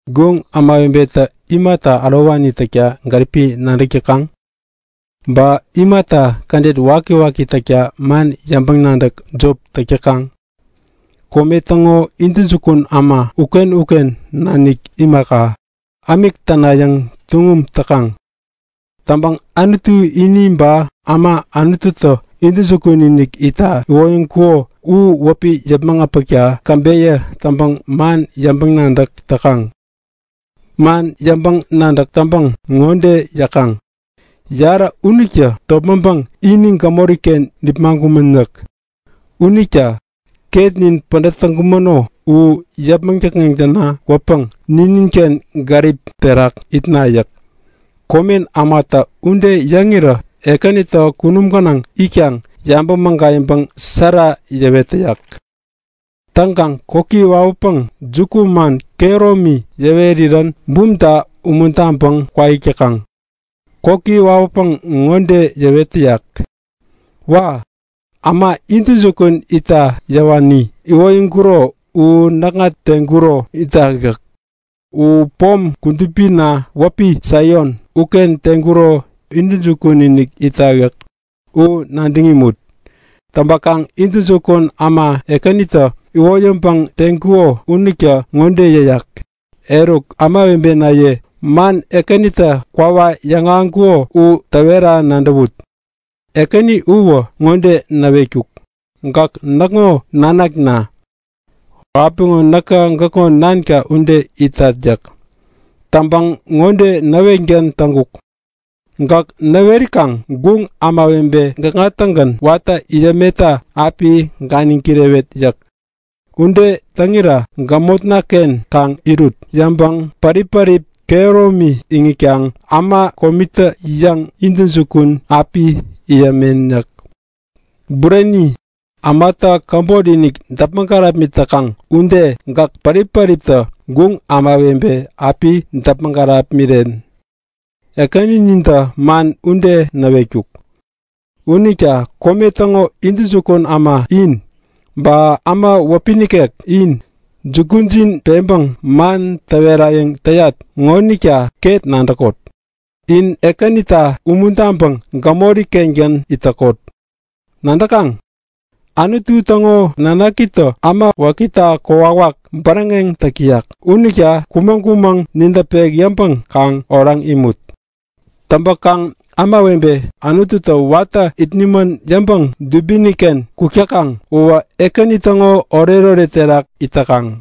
Guŋ ämawebetä imata ärowani täkta gäripi nadäk täkaŋ? Ba imata kädet wakiwaki täkta man yäŋpäŋ-nadäk jop täk täkaŋ? Kome täŋo intäjukun äma uken-uken nanik imaka, ämik tänayäŋ tuŋum täkaŋ. Täŋpäŋ Anutu ini ba äma Anututä intäjukun-inik itta iwoyäŋkuko u wäpi yäpmäŋ äpäkta käbeyä täŋpäŋ man yäŋpäŋ-nadäk täkaŋ. Man yäŋpäŋ-nadäk täŋpäŋ ŋode yäkaŋ; Yarä unitä topmäŋpäŋ ini gämoriken nipmaŋkumän yäk. Unita ketnin pädät täŋkumäno u yäpmäŋ däkŋeŋ täna kwäpäŋ nininken gärip terak itna yäk. Komen ämatä ude yäŋirä Ekänitä kunum gänaŋ itkaŋ yabäŋ mägayäŋpäŋ sära yäwet täyak. Täŋkaŋ koki wawäpäŋ jukuman kehäromi yäwerirän bumta umuntaŋpäŋ kwaik täkaŋ. Koki wawäpäŋ ŋode yäwet täyak; Wa! Äma intäjukun itta yäwani iwoyäŋkuro u näkŋa teŋkuro itak yäk. U pom kudupina wäpi Saion uken teŋkuro intäjukun-inik itak yäk. U nadäŋ imut! Täŋpäkaŋ intäjukun äma Ekänitä iwoyäŋpäŋ teŋkuko unitä ŋode yäyak; Eruk ämawebenaye, man Ekänitä kwawak yäŋahäŋkuko u täwera nadäwut. Ekäni uwä ŋode näwetkuk; Gäk näkŋo nanakna. Apiŋo näkä gäkŋo nanka ude itat yäk. Täŋpäŋ ŋode näwetgän täŋkuk; Gäk näwerikaŋ guŋ ämawebe gäkŋa-tägän watä it yämenta api ganiŋ kirewet yäk. Ude täŋira gämotnaken kaŋ irut yäŋpäŋ pärip-pärip kehäromi iŋitkaŋ äma komitä-yäŋ intäjukun api it yämen yäk. Bureni, ämatä käbotinik däpmäŋ kärapmit täkaŋ ude gäk pärip-päriptä guŋ ämawebe api däpmäŋ kärapmiren. Ekäninatä man ude näwetkuk. Unita kome täŋo intäjukun äma in, ba äma wäpi nikek in, jukujin peŋpäŋ man täwerayäŋ täyat ŋonita ket nadäkot. In Ekänita umuntaŋpäŋ gämori-kengän it täkot. Nadäkaŋ? Anutu täŋo nanakitä äma wakita kokwawak bäräŋeŋ täk täyak unita kumäŋ-kumäŋ nidäpek yäŋpäŋ kaŋ oraŋ imut. Täŋpäkaŋ ämawebe Anututä watä it nimän yäŋpäŋ dubiniken kuk täkaŋ uwä Ekäni täŋo oretoret terak it täkaŋ.